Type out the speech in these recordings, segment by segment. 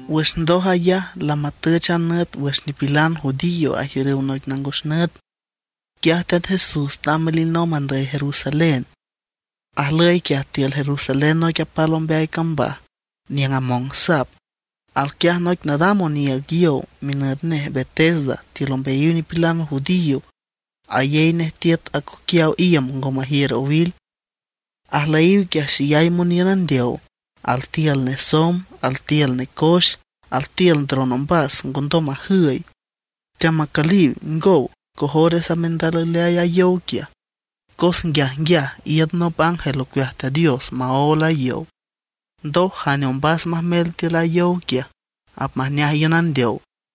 Wüx ndoj ayaj lamatüch a nüt wüx nipilan judío ajiürüw noic nangos nüt. Quiaj Teat Jesús tamb alinomb andüy Jerusalén. Ajlüy quiaj tiül Jerusalén noic apal ombeay cambaj niüng among sap. Alquiaj noic nadam oniiüg yow, minüt nej Betesda tiül ombeayiw nipilan judío. Ayey nej tiüt acoquiaw iüm ngo majiür owil. Ajlüyiw quiaj xeyay moniün andeow: altiül nesomb, altiül necoex, altiül ndron ombas ngondom majüy. Teamacüliw ngow, cojores apmendalalüy a yow quiaj. Cos nguiajnguiaj iün nop ángel ocueaj Teat Dios maól a yow, ndoj jane ombas apmajmel tiül a yow quiaj apmajneaj iün andeow.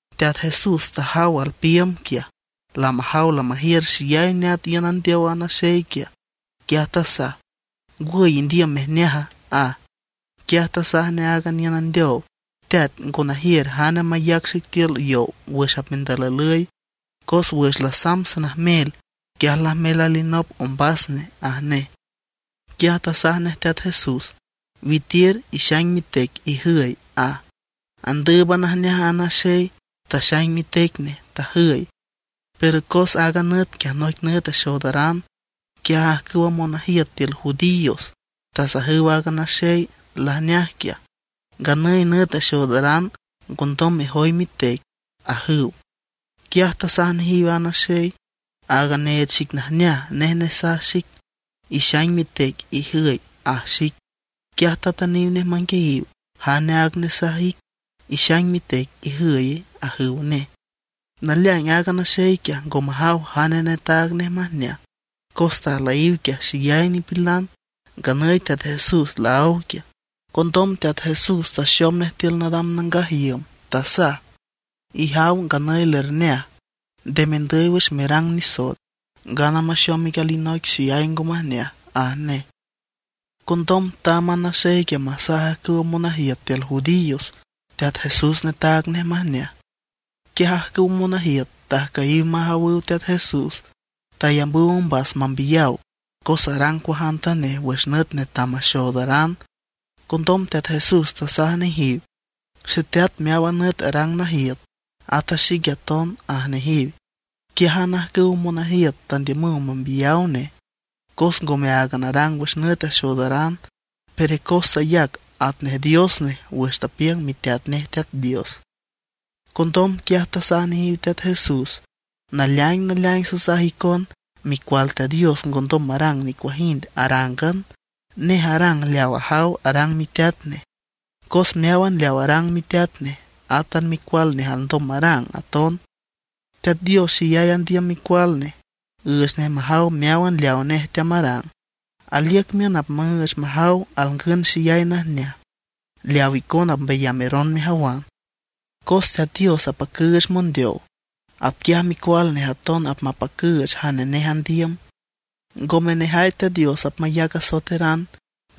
Teat Jesús tajaw alpiiüm quiaj, lamajaw lamajiür xeyay neat iün andeow a naxey quiaj, quiaj tasaj: ―¿Ngwüy indiüm mejneaja? ―aj. Quiaj tasaj nej aaga niün andeow: ―Teat, ngo najiür jane mayac xic tiül yow wüx apmendalalüy. Cos wüx lasamb sanajmel, quiaj lajmel alinop ombas nej ―aj nej. Quiaj tasaj nej Teat Jesús: ―Witiür, ixaing mitec ijüy ―aj. Andǘüban ajneaj a naxey quiaj, taxaing mitec nej, tajüy. Pero cos aaga nüt quiaj, noic nüt axoodaran, quiaj ajcüwa monajiüt tiül judíos tasajüw aaga naxey lajneaj quiaj: ―Nganüy nüt axoodaran, ngondom mexaing mejoy mitec ―ajüw. Quiaj tasaj nejiw aaga naxey: ―Aaga neech xic najneaj, nej nesaj xic: “Ixaing mitec, ijüy” ―aj xic. Quiaj tatüniw nej manguiayiw: ―¿Jane aaga nesaj ic: “Ixaing mitec, ijüye”? ―ajüw nej. Naleaing aaga naxey quiaj ngo majaw jane netaag nej majneaj, cos tajlüyiw quiaj xeyay nipilan, nganüy Teat Jesús laáw quiaj. Condom Teat Jesús taxom nej tiül nadam nangaj iüm. Tasaj: ―Ijaw nganüy lerneaj, nde mendüy wüx merang nisoet, ngana maxom ic alinoic xeyay ngo majneaj ―aj nej. Condom tamb a naxey quiaj masaj ajcüwa monajiüt tiül judíos Teat Jesús netaag nej majneaj. Quiaj ajcüwa monajiüt tajcüyiw majawüw Teat Jesús, tayambüw ombas mambiyaw cos arang cuajantanej wüx nüt netam maxoodaran. Condom Teat Jesús tasaj nejiw: ―Xeteat meáwan nüt arang najiüt, ata xique aton ―aj nejiw. Quiájan ajcüwa monajiüt tandiümüw mambiyaw nej cos ngome áagan arang wüx nüt axoodaran, pero cos tayac atnej Dios nej wüx tapiüng miteat nej Teat Dios. Condom quiaj tasaj nejiw Teat Jesús: ―Naleaing naleaing sasaj icon, Micual Teat Dios ngondom marang nicuajind arángan; nej arang leaw ajaw arang miteat nej. Cos meáwan leaw arang miteat nej, átan micual nej alndom marang aton. Teat Dios xeyay andiüm Micual Nej, üüch nej majaw meáwan leawa nej teamarang; aliüc miün apmüüch majaw alngün xeyay najneaj leawa icona apmbayameron mejawan. Cos Teat Dios apacüüch mondeow, atquiaj Micual Nej aton apmapacüüch jane nej andiüm. Ngome nejay Teat Dios apmayac asoeteran,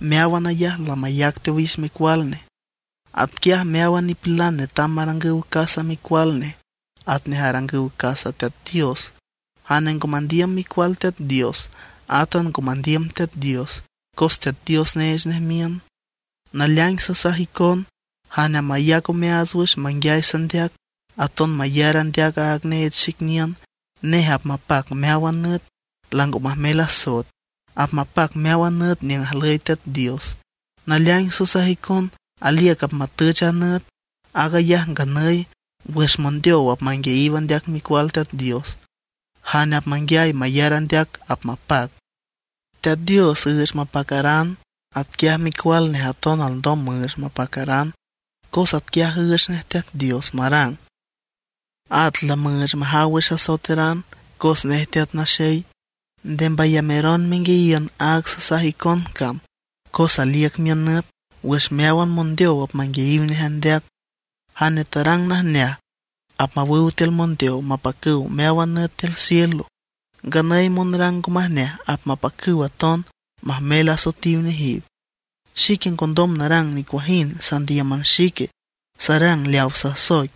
meáwan ayaj lamayac teowix Micual Nej. Atquiaj meáwan nipilan netam marangüw casa Micual Nej atnej arangüw casa Teat Dios. Jane ngo mandiüm Micual Teat Dios, átan ngo mandiüm Teat Dios, cos Teat Dios neech nej miün. ’Naleaing sasaj icon: Jane apmayac omeaats wüx manguiay sandeac, aton mayar andeac aaga neech xic niün, nej apmapac meáwan nüt, lango majmel asoet. Apmapac meáwan nüt niüng ajlüy Teat Dios. Naleaing sasaj icon, aliüc apmatüch a nüt, aag ayaj nganüy, wüx mondeow apmanguiayiw andeac Micual Teat Dios. Jane apmanguiay mayar andeac apmapac. Teat Dios üüch mapacaran, atquiaj Micual Nej aton alndom müüch mapacaran, cos atquiaj üüch nej Teat Dios marang. At lamüüch majaw wüx asoeteran cos nej Teat Naxey. Nde mbayameron menguiayiün aaga sasaj icon cam, cos aliüc miün nüt wüx meáwan mondeow apmanguiayiw nej andeac. Jane tarangüw najneaj apmawüw tiül mondeow mapacüw meawan nüt tiül cielo; nganüy monarang ngo majneaj apmapacüw aton majmel asoetiw nejiw. ’Xique ngondom narang nicuajind sandíüman xique, sarang leawa sasoic.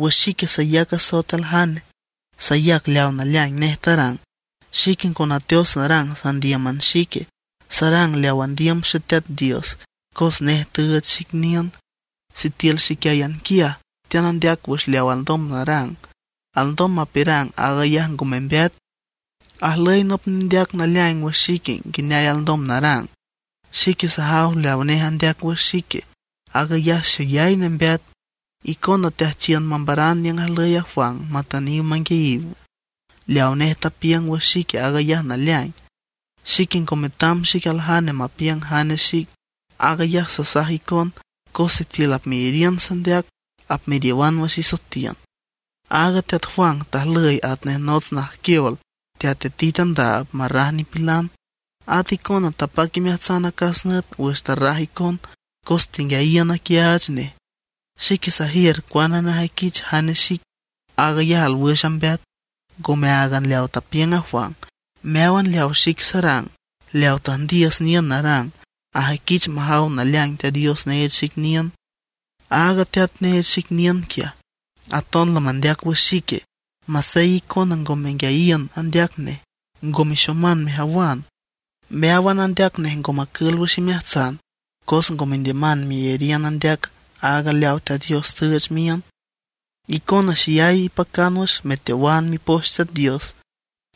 Wüx xique sayac asoet aljane, sayac leaw naleaing nej tarang. Xique ngo nateots narang sandíüman xique, sarang leaw andiüm Xeteat Dios, cos nej tüüch xic niün. Sitiül xiquiáyan quiaj teanandeac wüx leaw alndom narang, alndom mapiürang aag ayaj ngo membeat. Ajlüy nop nendeac naleaing wüx xique nguineay alndom narang. Xique sajaw leaw nej andeac wüx xique, aag ayaj xeyay nembeat. Icona teajchiün mambaran niüng ajlüy Juan matüniw manguiayiw nej. Leaw nej tapiüng wüx xique aag ayaj naleaing. Xique ngo metam xic aljane mapiüng jane xic. Aag ayaj sasaj icon cos sitiül apmeyariün sandeac apmeriowan wüx isoetiün. Aaga teat Juan tajlüy atnej nots najquiol teatitit andaab marraj nipilan. At icona tapac imeajtsan acas nüt wüx tarraj icon cos tenguiayiün aquiaach nej. Xique sajiür cuane nejüiquich jane xic; aag ayaj alwüx ambeat, ngome áagan leaw tapiüng a Juan. Meáwan leawa xic sarang, leaw tüjndiüs niün narang, ajüiquich majaw naleaing Teat Dios neech xic niün. Aaga Teat neech xic niün quiaj, aton lamandeac wüx xique; masey icona ngo menguiayiün andeac nej, ngo mexoman mejawan. Meáwan andeac nej ngo macül wüx imeajtsan, cos ngo mendiüman meyariün andeac aaga leawa Teat Dios tüüch miün. Icona xeyay ipacan wüx meteowan Mipoch Teat Dios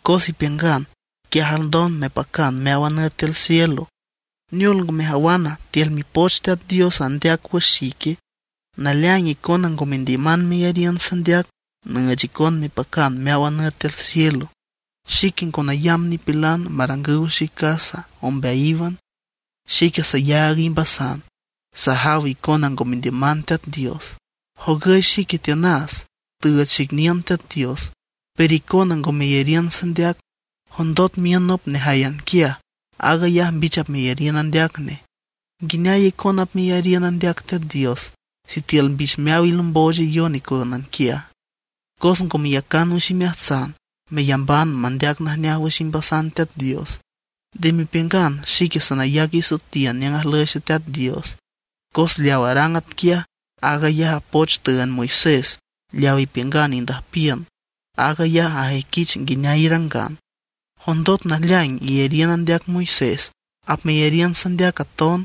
cos ipiüngan quiaj alndom mepacan meáwan nüt tiül cielo. ¿Neol ngo mejawana, tiül Mipoch Teat Dios andeac wüx xique? Naleaing icona ngo mendiüman meyariün sandeac nüüch icon mepacan meáwan nüt tiül cielo. ’Xique ngo nayamb nipilan marangüw xic casa ombeayíwan. Xique sayaag imbasan, sajaw icona ngo mendiüman Teat Dios. Jogüy xique tiünas, tüüch xic niün Xeteat Dios, pero icona ngo meyariün sandeac. Jondot miün nop nejáyan quiaj, aag ayaj mbich apmeyariün andeac nej. ¿Nguineay icona apmeyariün andeac Teat Dios sitiül mbich meaw ilombochayon icoyónan quiaj? Cos ngo meyacan wüx imeajtsan meyamban mandeac najneaj wüx imbasan Teat Dios. Nde mepiüngan xique sanayac isoetiün niüng ajlüy Xeteat Dios; cos leaw arang atquiaj, aag ayaj a poch tüünd Moisés leaw ipiüngan indüjpiün. Aag ayaj ajüiquich nguineay irangan. Jondot naleaing iyariün andeac Moisés, apmeyariün sandeac aton,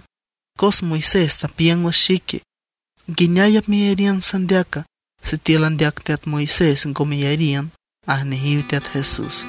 cos Moisés tapiüng wüx xique. ¿Nguineay apmeyariün sandeaca, sitiül andeac teat Moisés ngo meyariün? ―aj nejiw Teat Jesús.